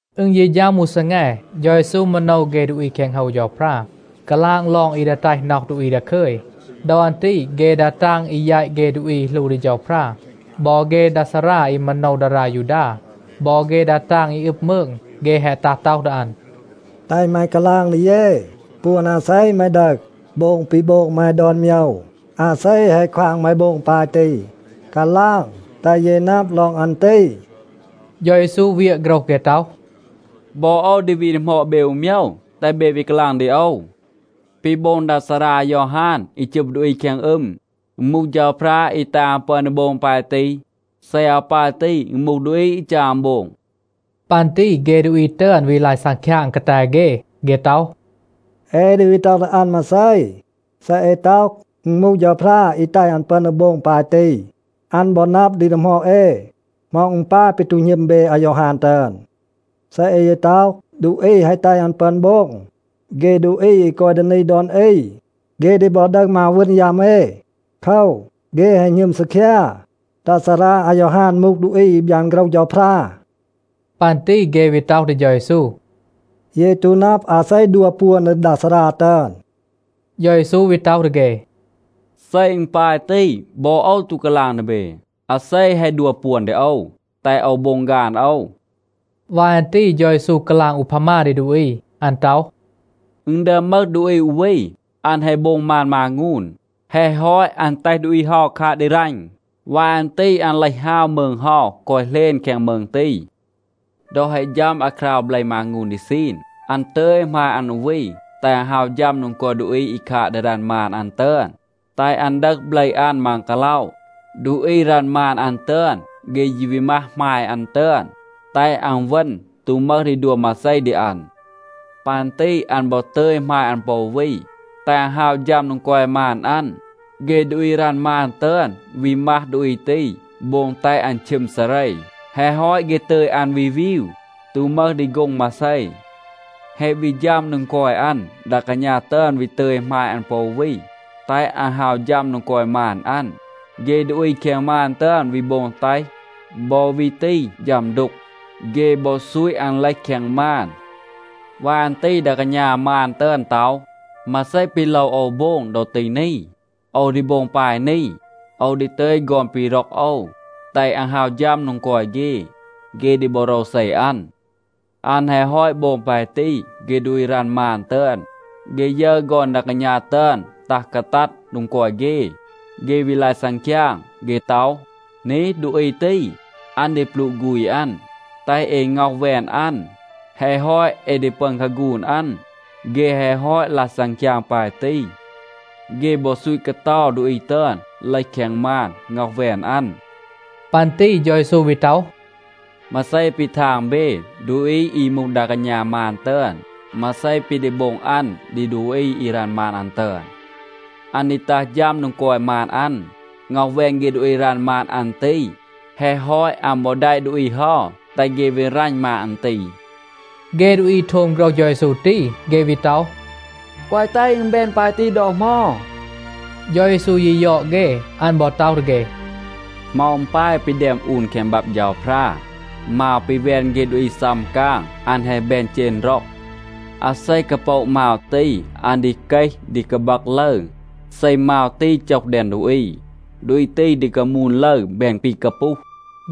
อึณ ยี ฌัม อู ซีแง, เฌา เยซู มาโนว เฆ ดูอี แคง โฮว เฌาพรา, กาลาง ลอง อี ดี แตห น็อห ดูอี ดาคึย. ดอ อัน ตี เฆ ดา ตาง อี แยต เฆ ดูอี อี หลู ดี เฌาพรา บอ เฆ ดา ซารา อี มาโนว ดารา ยูดา บอ เฆ ดา ตาง อี อึบ มืง, เฆ แฮะ ตัห ต็อห ดี อัน, “แตห แม กาลาง ดี เย, ปวน อาเซ แม ดึห, โบง ปี โบง แม ดอน โมยว? อาเซ แฮะ ควาง แม โบง ปาย ตี? กาลาง, แตห เย นับ ลอง อัน ตี.” เฌา เยซู เวียะ โฆรห เฆ ต็อห, “บอ โอว ดี วี ดีหมอด เบ อู โมยว, แตห เบ วี กาลาง ดี โอว. ปี โบง ดา ซารา อายอฮาน อี จึบ ดูอี แคง อึม, อึณ มูห เฌาพรา อี แตห อัน ปึอน ดี โบง ปาย ตี? เซ อาว ปาย ตี, อึณ มูห ดูอี, อี จัร อัน โบง?” ปัน ตี เฆ ดูอี ตึอน วี ลาย ซังคยาง กาแต เฆ. เฆ ต็อห, “เอ ดี วี ต็อห ดี อัน มาเซ? เซ เอ ต็อห, อึณ มูห เฌาพรา อี แตห อัน ปึอน ดี โบง ปาย ตี, อัน บอ นับ ดี ดีหมอด เอ, ‘เหมา อึณ ปาย ปี ตู หณึม เบ อายอฮาน ตึอน?’ เซ เอ ยี ต็อห, ดูอี แฮะ แตห อัน ปึอน โบง, เฆ ดูอี อี กอย ดี นี ดอน อี, เฆ ดี บอ ดึห มาว วึณ ยัม เอ. โคว, เฆ แฮะ หณึม ซีคยา, ดา ซารา อายอฮาน มูห ดูอี อี บยาน โฆรห เฌาพรา.” ปัน ตี เฆ วี ต็อห ดี เฌา เยซู, “เย ตู นับ อาเซ ดัว ปวน ดี ดา ซารา ตึอน.” เฌา เยซู วี ต็อห ดี เฆ, “เซ อึณ ปาย ตี, บอ โอว ตู กาลาง ดี เบ, อาเซ แฮะ ดัว ปวน ดี โอว, แตห โอว โบง ฆาน โอว.” วาย อัน ตี เฌา เยซู กาลาง อูพามา ดี ดูอี. อัน ต็อห, “อึณ ดึอม มึห ดูอี อู วี, อัน แฮะ โบง มาน มางูน. แฮะ ฮอต, อัน แตห ดูอี เฮา คาด ดี รัณ. วาย อัน ตี อัน เลห ฮาว มืง เฮา, กอย เหลณ แคง มืง ตี. ดอ แฮะ ฌัม อาคราว เบล มางูน ดี ซีน, อัน ตึย หมาย อัน อู วี, แตห อัน ฮาว ฌัม โดง กอย ดูอี อี คาด ดี รัณ มาน อัน ตึอน, แตห อัน ดึห เบล อัน มัง กาล็อะ. ดูอี รัณ มาน อัน ตึอน, เฆ ยี วี มัห หมาย อัน ตึอน, แตห อัน เวณ, ตู มึห ดี ดัว มาเซ ดี อัน. ปัน ตี อัน บอ ตึย หมาย อัน ปอ อู วี, แตห อัน ฮาว ฌัม โดง กอย มาน อัน. เฆ ดูอี รัณ มาน ตึอน วี มัห ดูอี ตี, โบง แตห อัน ชึม ซาเร. แฮะ ฮอต เฆ ตึย อัน วี วีว, ตู มึห ดี โฆ็ง มาเซ. แฮะ วี ฌัม โดง กอย อัน, ดา กาณา ตึอน วี ตึย หมาย อัน ปอ อู วี, แตห อัน ฮาว ฌัม โดง กอย มาน อัน. เฆ ดูอี แคง มาน ตึอน วี โบง แตห บอ วี ตี ฌัม ดูก. เฆ บอ ซูต อัน เลห แคง มาน. วาย อัน ตี ดา กาณา มาน ตึอน ต็อห, ‘มาเซ ปี โลว โอว โบง ดอ ตี นี? โอว ดี โบง ปาย นี. โอว ดี ตึย ฆอน ปี ร็อก โอว, แตห อัน ฮาว ฌัม โดง กอย เฆ. เฆ ดี บอ โรวเซ อัน.’ อัน แฮะ ฮอต โบง ปาย ตี, เฆ ดูอี รัณ มาน ตึอน, เฆ ยึร ฆอน ดา กาณา ตึอน ตัห กาตัด โดง กอย เฆ, เฆ วี ลาย ซังคยาง. เฆ ต็อห, ‘นี, ดูอี ตี, อัน ดี ปลูะ ฆูณ อัน. แตห เอ ง็อห แวน อัน. แฮะ ฮอต, เอ ดี ปึอน คาฆูน อัน.’ เฆ แฮะ ฮอต ลาย ซังคยาง ปาย ตี, เฆ บอ ซูต กาเตา ดูอี ตึอน เลห แคง มาน, ง็อห แวน อัน.” ปัน ตี เฌา เยซู วี ต็อห, “มาเซ ปี ทาง เบ, ดูอี อี มูห ดา กาณา มาน ตึอน, มาเซ ปี ดี โบง อัน ดี ดูอี อี รัณ มาน อัน ตึอน? อัน ดี ตัห ฌัม โดง กอย มาน อัน, ง็อห แวน เฆ ดูอี รัณ มาน อัน ตี. แฮะ ฮอต, อัน บอ แดะ ดูอี เฮา, แตห เฆ วี รัณ มาน อัน ตี,” เฆ ดูอี โทม โฆรห เฌา เยซู ตี, เฆ วี ต็อห, “แกวะ แตห อึณ แบน ปาย ตี ดอ เหมา.” เฌา เยซู ยี ยอด เฆ. อัน บอ ต็อห ดี เฆ, “เหมา อึณ ปาย ปี แดม อูน แคง บับ เฌาพรา, ‘มาว ปี แวน เฆ ดูอี ซัม กาง, อัน แฮะ แบน เจณ ร็อง.’ อาเซ กาโปะ มาว ตี, อัน ดี เกห, ดี กาบัก ลึร. เซ มาว ตี โจห แดง ดูอี, ดูอี ตี ดี กามูน ลึร, แบน ปี กาปูห.”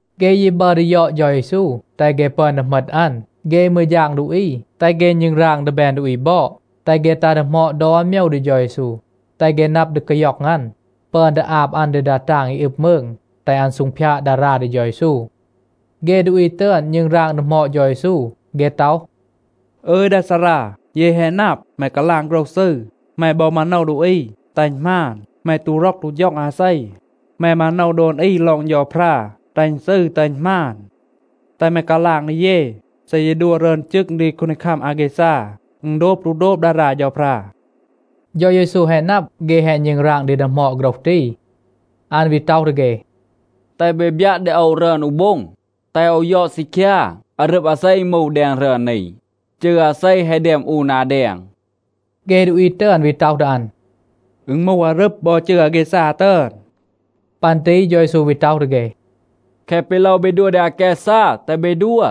เฆ ยี บัร ดี ยอด เฌา เยซู, แตห เฆ ปึอน ดี เหมต อัน. เฆ มืร ฌาง ดูอี, แตห เฆ ณึงราง ดี แบน ดูอี บอด, แตห เฆ ตัห ดีหมอด ดอน โมยว ดี เฌา เยซู, แตห เฆ นับ ดี กาย็อง อัน, ปึอน ดี อาบ อัน ดี ดา ตาง อี อึบ มืง, แตห อัน ซูงพยาด ดารา ดี เฌา เยซู. เฆ ดูอี ตึอน ณึงราง ดีหมอด เฌา เยซู. เฆ ต็อห, “อึย ดา ซารา, เย แฮะ นับ, แม กาลาง โฆรห ซืร. แม บอ มาโนว ดูอี, แตห อึณ หมาน. แม ตู ร็อก ตู ฌ็อง อาเซ. แม มาโนว ดอน อี ลอง เฌาพรา, แตห อึณ ซืร แตห อึณ หมาน. แตห แม กาลาง ดี เย, เซ เย ดัว รึอน จึง ดี คูนดีคัม อาแกซา, อึณ โดบ ตู โดบ ดารา เฌาพรา?” เฌา เยซู แฮะ นับ, เฆ แฮะ ณึงราง ดี ดีหมอด โฆรห ตี. อัน วี ต็อห ดี เฆ, “แตห เบ บยัะ ดี โอว รึอน อู โบ็ง, แตห โอว ยอด ซีคยา. อารึบ อาเซ อึณ มูห แดง รึอน นี? จืร อาเซ แฮะ แดม อูน นา แดง?” เฆ ดูอี ตึอน วี ต็อห ดี อัน, “อึณ มูห อารึบ บอ จืร อาแกซา ตึอน.” ปัน ตี เฌา เยซู วี ต็อห ดี เฆ, “แคะ ปี โลว เบ ดัว ดี อาแกซา, แตห เบ ดัว.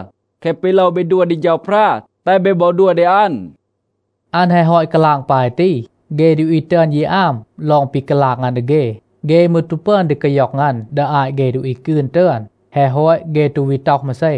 แคะ ปี โลว เบ ดัว ดี เฌาพรา, แตห เบ บอ ดัว ดี อัน.” อัน แฮะ ฮอต กาลาง ปาย ตี, เฆ ดูอี ตึอน ยี อาม ลอง ปี กาลาง อัน ดี เฆ. เฆ มืร ตู ปึอน ดี กาย็อง อัน ดี อาต เฆ ดูอี กืน ตึอน. แฮะ ฮอต, เฆ ตู วี ต็อห มาเซ.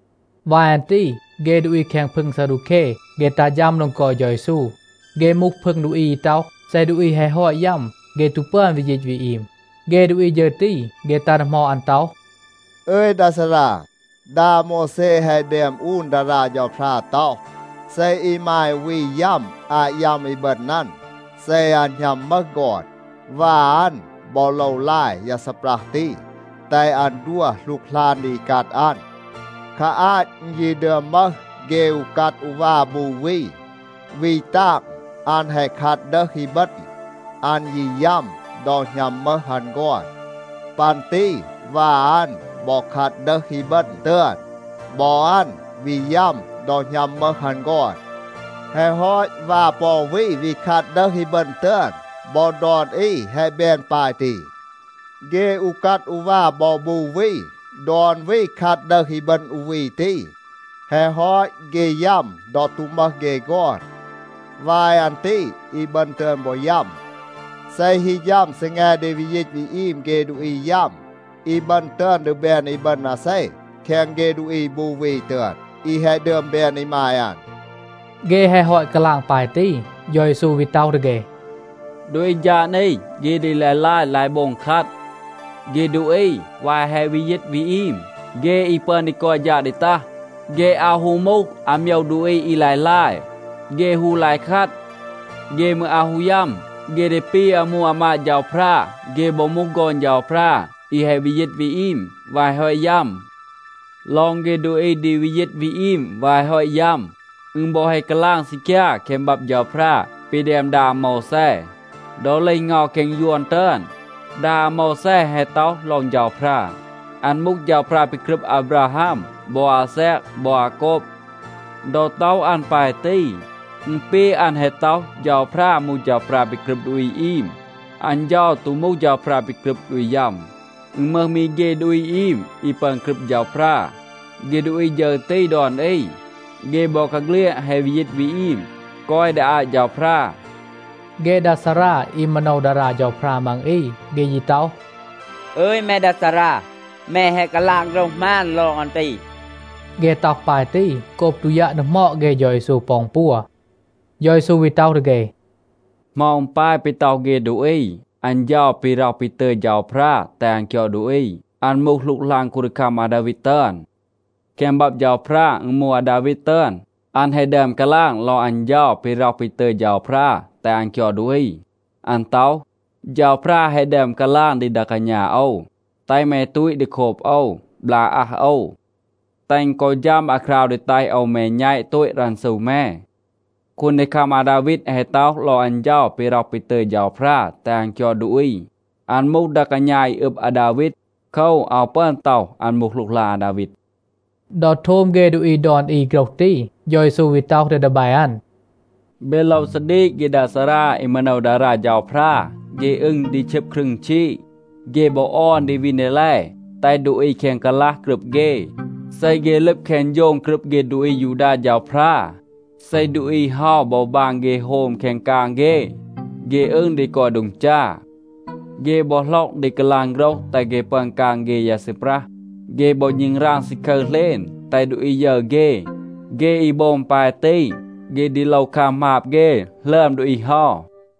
วาย อัน ตี เฆ ดูอี แคง พึง ซาดูแค, เฆ ตัห ฌัม โดง กอย เฌา เยซู. เฆ มูห พึง ดูอี อี ต็อห, เซ ดูอี แฮะ ฮอต ยัม, เฆ ตู ปึอน วี ยีต วี อีม. เฆ ดูอี ฌึร ตี, เฆ ตัห ดีหมอด อัน ต็อห, “อึย ดา ซารา, ดา อาโมวแซ แฮะ แดม อูน ดารา เฌาพรา ต็อห, ‘เซ อีมาย อู วี ยัม อาต ยัม อีบึณ อัน, เซ อัน หณัม มึห ฆอน, วา อัน บอ โลว ลาย ยา ซีปรัห ตี, แตห อัน ดัว หลูกหลาน ดี อีกัด อัน.’ คา อาต อึณ ยี ดึอม มึห เฆ อูกัด อูวา บู วี. วี ตาง, อัน แฮะ คัด ดึห อีบึณ. อัน ยี ยัม ดอ หณัม มึห อัน ฆอน. ปัน ตี วา อัน บอ คัด ดึห อีบึณ ตึอน. บอ อัน วี ยัม ดอ หณัม มึห อัน ฆอน. แฮะ ฮอต วา ปอ อู วี วี คัด ดึห อีบึณ ตึอน. บอ ดอน อี แฮะ แบน ปาย ตี. เฆ อูกัด อูวา บอ บู วี, ดอน วี คัด ดึห อีบึณ อู วี ตี. แฮะ ฮอต, เฆ ยัม ดอ ตู มึห เฆ ฆอน. วาย อัน ตี อีบึณ ตึอน บอ ยัม. เซ ฮี ฌัม ซีแง ดี วี ยีต วี อีม เฆ ดูอี ยัม, อีบึณ ตึอน ดี แบน อีบึณ อาเซ แคง เฆ ดูอี บู วี ตึอน, อี แฮะ ดึอม แบน อีมาย อัน?” เฆ แฮะ ฮอต กาลาง ปาย ตี, เฌา เยซู วี ต็อห ดี เฆ, “ดูอี ฌาด นี เฆ ดี ลาย ลาย, ลาย โบง คัด. เฆ ดูอี, วาย แฮะ วี ยีต วี อีม, เฆ อี ปึอน ดี กอย ฌาด ดี ตัห, เฆ อาว ฮู มูห อาโมยว ดูอี อี ลาย ลาย. เฆ ฮู ลาย คัด. เฆ มืร อาว ฮู ยัม. เฆ ดี ปี อามู อามาด เฌาพรา. เฆ บอ มูห ฆอน เฌาพรา อี แฮะ วี ยีต วี อีม วาย แฮะ ฮอต ยัม. ลอง เฆ ดูอี ดี วี ยีต วี อีม วาย แฮะ ฮอต ยัม, อึณ บอ แฮะ กาลาง ซีคยา แคง บับ เฌาพรา ปี แดม ดา อาโมวแซ. ดอ เลห เงา แคง ยวน ตึอน, ดา อาโมวแซ แฮะ ต็อห ลอง เฌาพรา, อัน มูห เฌาพรา ปี กรึบ อาบราฮัม บอ อาแซก บอ อาโกบ. ดอ ต็อห อัน ปาย ตี, อึณ ปี อัน แฮะ ต็อห, เฌาพรา มูห เฌาพรา ปี กรึบ ดูอี อีม. อัน เฌา ตู มูห เฌาพรา ปี กรึบ ดูอี ยัม. อึณ มึห มี เฆ ดูอี อีม อี ปึอน กรึบ เฌาพรา. เฆ ดูอี ฌึร ตี ดอน อี, เฆ บอกาเฆลียด แฮะ วี ยีต วี อีม, กอย ดี อาต เฌาพรา.” เฆ ดา ซารา อี มาโนว ดารา เฌาพรา มัง อี, เฆ ยี ต็อห, “อึย, แม ดา ซารา, แม แฮะ กาลาง โฆรห หมาน ลอง อัน ตี.” เฆ ต็อห ปาย ตี, โกบ ตู ยัะ ดีหมอด เฆ เฌา เยซู ปอ อึณ ปัว. เฌา เยซู วี ต็อห ดี เฆ, “เหมา อึณ ปาย ปี ต็อห เฆ ดูอี, อัน เฌา ปี ร็อห ปี ตึย เฌาพรา แตห อัน คยอด ดูอี, อัน มูห หลูกหลาน คูนดีคัม อาดาวีด ตึอน? แคง บับ เฌาพรา, อึณ มูห อาดาวีด ตึอน, อัน แฮะ ดึอม กาลาง ลอง อัน เฌา ปี ร็อห ปี ตึย เฌาพรา แตห อัน คยอด ดูอี. อัน ต็อห, ‘เฌาพรา แฮะ ดึอม กาลาง ดี ดา กาณา โอว, แตห แม ตูต ดี โคบ โอว, บลาก อาอัห โอว, แตห อึณ กอ ฌัม อาคราว ดี แตห โอว แม แณต โตต รันซู แม.’ คูนดีคัม อาดาวีด แฮะ ต็อห ลอง อัน เฌา ปี ร็อห ปี ตึย เฌาพรา แตห อัน คยอด ดูอี, อัน มูห ดา กาณา อี อึบ อาดาวีด. โคว, อาว ปึอน ต็อห, อัน มูห หลูกหลาน อาดาวีด.” ดอ โทม เฆ ดูอี ดอน อี โฆรห ตี, เฌา เยซู วี ต็อห ดี ดีแบ อัน, “เบ โลว ซาดีก เฆ ดา ซารา อี มาโนว ดารา เฌาพรา. เฆ อึง ดี ชึบ ครึง ชีด. เฆ บอ ออน ดี วีน ดีแล, แตห ดูอี แคง กาลัห กรึบ เฆ. เซ เฆ ลึบ แคง โฌง กรึบ เฆ ดูอี อายูดา เฌาพรา, เซ ดูอี เฮา บอ บาง เฆ โฮม แคง กาง เฆ, เฆ อึง ดี กอย โดง จา. เฆ บอ หล็อก ดี กาลาง โฆรห แตห เฆ ปึอน กาง เฆ ยา ซีปรัห. เฆ บอ ณึงราง ซาคึร เหลณ, แตห ดูอี ยึร เฆ. เฆ อี โบง ปาย ตี, เฆ ดี โลว คัม หมาบ เฆ หลึอม ดูอี เฮา.”